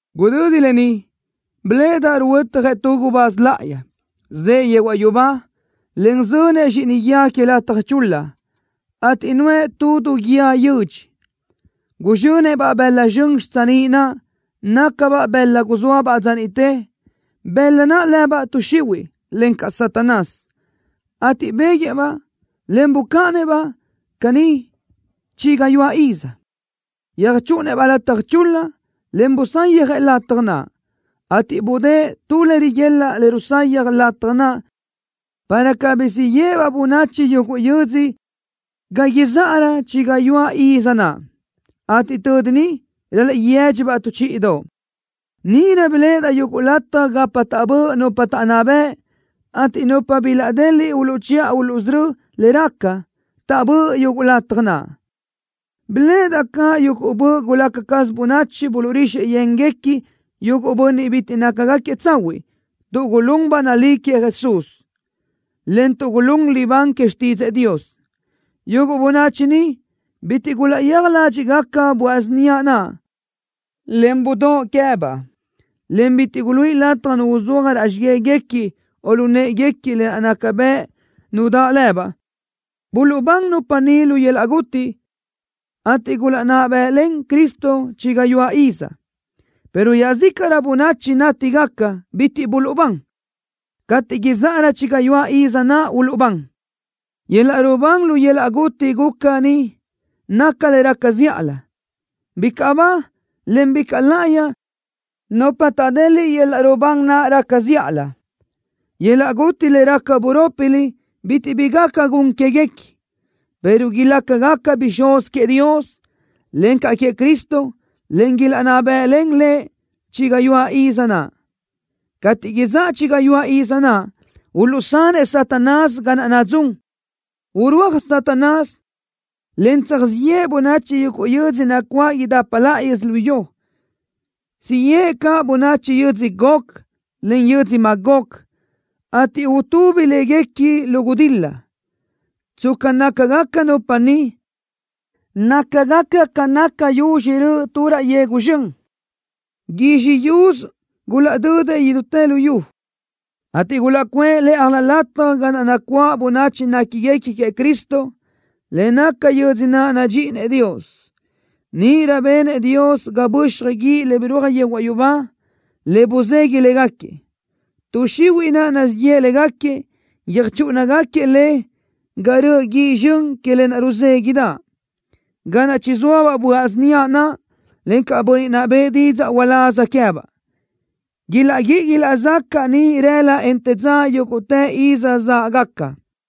Gudödi lë ni biléʼedaʼ ruhuötjëʼ tu gubáz láʼayi, zëʼë yehuaʼ yubá, en zönëʼ zxíʼini guíë que lataj chul-la, ateʼ nuʼë tu du guíë yödx. Guzxönëʼ-baʼ bëla zxön xitsiníʼ naʼ, nácabaʼ bëla guzóabaʼ dza niʼte, bëla naʼ lëbaʼ Tuʼ Xihuiʼ, encaʼ Satanás, ateʼ béguëʼë-baʼ, en bucáʼanëʼ-baʼ caní chi gayuáʼ iz. Yöjchúʼunëʼ-baʼ lataj chul-la, en busayjëʼ lataj naʼ, ateʼ budë́ʼë tu le riguelaʼ le rusayaj lataj naʼ para cabirö siʼ yéʼebaʼ bönachi yuguʼ yödzö ga izáʼarö chi gayuáʼ iz naʼ, ateʼ tödi niʼ ral-laʼ yédxibaʼ tu chíʼidoʼ. Níʼirö biléʼedaʼ yuguʼ lataj gapa taʼbö́ʼ nupa taʼnná bëʼ, ateʼ nupa bilaʼdeliʼ uluʼchiʼa uluʼsörö́ le raca taʼbö́ʼ yuguʼ lataj naʼ. Biléʼedaʼ caʼ yuguʼ böʼ gulaca caz bönachi buluʼrixëʼ yénguequi yuguʼ bönniʼ bitiʼ nácagaquiëʼ tsahuiʼ tuʼ gulún ba nalí queëʼ Jesús, en tuʼ gulún libán que xtídzëʼë Dios. Yuguʼ bönachi ni bitiʼ gulaʼyéaj ládxiʼgaca böaʼ síniaʼ naʼ, en budóʼ queë́baʼ, en bitiʼ guluíʼi lataj nu uzúaj raʼ xigáguequi, o lu në́ʼeguequi lë naʼ naca bëʼ nu daʼ lëbaʼ. Buluʼbán nupa ni lu yöl-laʼ guti, ateʼ gulaʼnná bë́ʼlen Cristo chi gayuáʼ iz, pero iaʼzícaʼrö bönachi nátigaca bitiʼ buluʼbán. Cateʼ izáʼarö chi gayuáʼ iz naʼ uluʼbán. Yöl-laʼ rubán lu yöl-laʼ guti guca ni naca le raca zíʼalö. ¡Bicaʼ ba, en bicaʼ láʼayi nupa taʼdeliʼ yöl-laʼ rubán naʼ raca zíʼalö! ¡Yöl-laʼ guti le raca burópilö bitiʼ bi gaca gun quéguequi, pero ilácagaca bixúz queëʼ Dios, encaʼ queëʼ Cristo, ateʼ ilaʼnná bë́ʼlen Lëʼ chi gayuáʼ iz naʼ! Cateʼ izáʼa chi gayuáʼ iz naʼ, uluʼsanëʼ Satanás ga naʼ nadzún. Urúaj Satanás, en tsöjzxíʼ yeʼe bönachi yuguʼ yödzö nacuáʼ idapa laʼa yödzölió. Siʼ yeʼe caʼ bönachi yödzö Gog, en yödzö Magog, ateʼ utubi léguequi lu gudil-la. Tsca nácagaca nupa ni, nácagaca ca naca yuzxi röʼö tu raʼ yegu zxön. Guizxi yusö gulaʼdödëʼ idútë luyú, ateʼ gulaʼcuʼë lë́ʼajlö lataj ga naʼ nacuáʼ bönachi néquiguequi queëʼ Cristo, le naca yödzö naʼ nadxíʼinëʼ Dios. Níʼirö benëʼ Dios ga böxaj guíʼ le birúaj yehuaʼ yubá, le buzeguiʼ légaquiëʼ. Tuʼ xihuiʼ naʼ nazíʼ yeʼe légaquiëʼ, yöjchúʼunagaquiëʼ le ga röʼö guíʼ zxön que lë naʼ ruzéguiʼdaʼ, ga naʼ chizóabaʼ böaʼ síniaʼ naʼ, encaʼ bönniʼ naʼ bëʼë didzaʼ uláz queë́baʼ. Ilaʼguíʼi ilaʼzacaʼ niʼ rëla, en te dza yúguʼtë iz záʼgaca.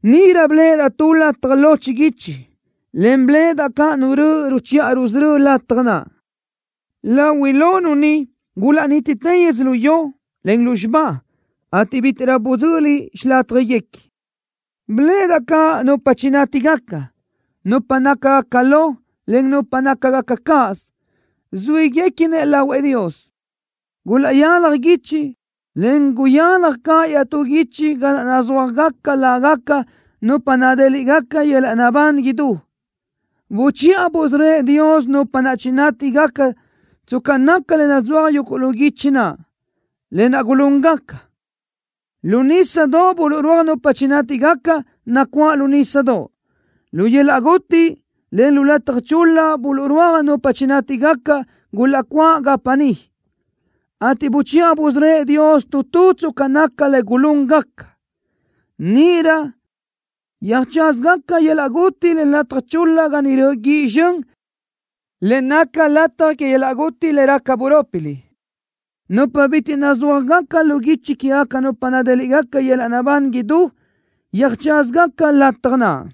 Níʼirö biléʼedaʼ tu lataj lo chiguichi, en biléʼedaʼ caʼ Nu röʼö ruchiʼa rusörö́ëʼ lataj naʼ. Lahuiʼ lo Nu ni gulaʼnítitë yödzölió, en lúzxiba, ateʼ bítiʼrö budzöli xilátjaguequi. Biléʼedaʼ caʼ nupa chinátigaca, nupa nácagaca lo, en nupa nácagaca cáʼasö, zuíguequinëʼ lahuëʼ Dios. Gulaʼyálaj guichi, en guyalaj caʼ iaʼtú guichi ga naʼ nazúajgaca lágaca nupa nadéliʼgaca yöl-laʼ naʼbán idú. Buchiʼa busörö́ëʼ Dios nupa naʼ chinátigaca tsca naca le nazúaj yuguʼ lu guichi naʼ, lë naʼ gulúngaca. Lu nísadoʼ buluʼrúaj nupa chinátigaca, nacuáʼ lu nísadoʼ. Lu yöl-laʼ guti, en lu lataj chul-la buluʼrúaj nupa chinátigaca, gulaʼcuáʼ gapa niʼ, ateʼ buchiʼa busörö́ëʼ Dios tu tu tsca naca le gulúngaca. Níʼirö yöjtsázagaca yöl-laʼ guti, en lataj chul-la ga niʼ röʼö guíʼ zxön le naca lataj que yöl-laʼ guti le raca burópilö. Nupa bitiʼ nazúajgaca lu guichi quégaca nupa nadéliʼgaca yöl-laʼ naʼbán idú yöjtsázagaca lataj naʼ.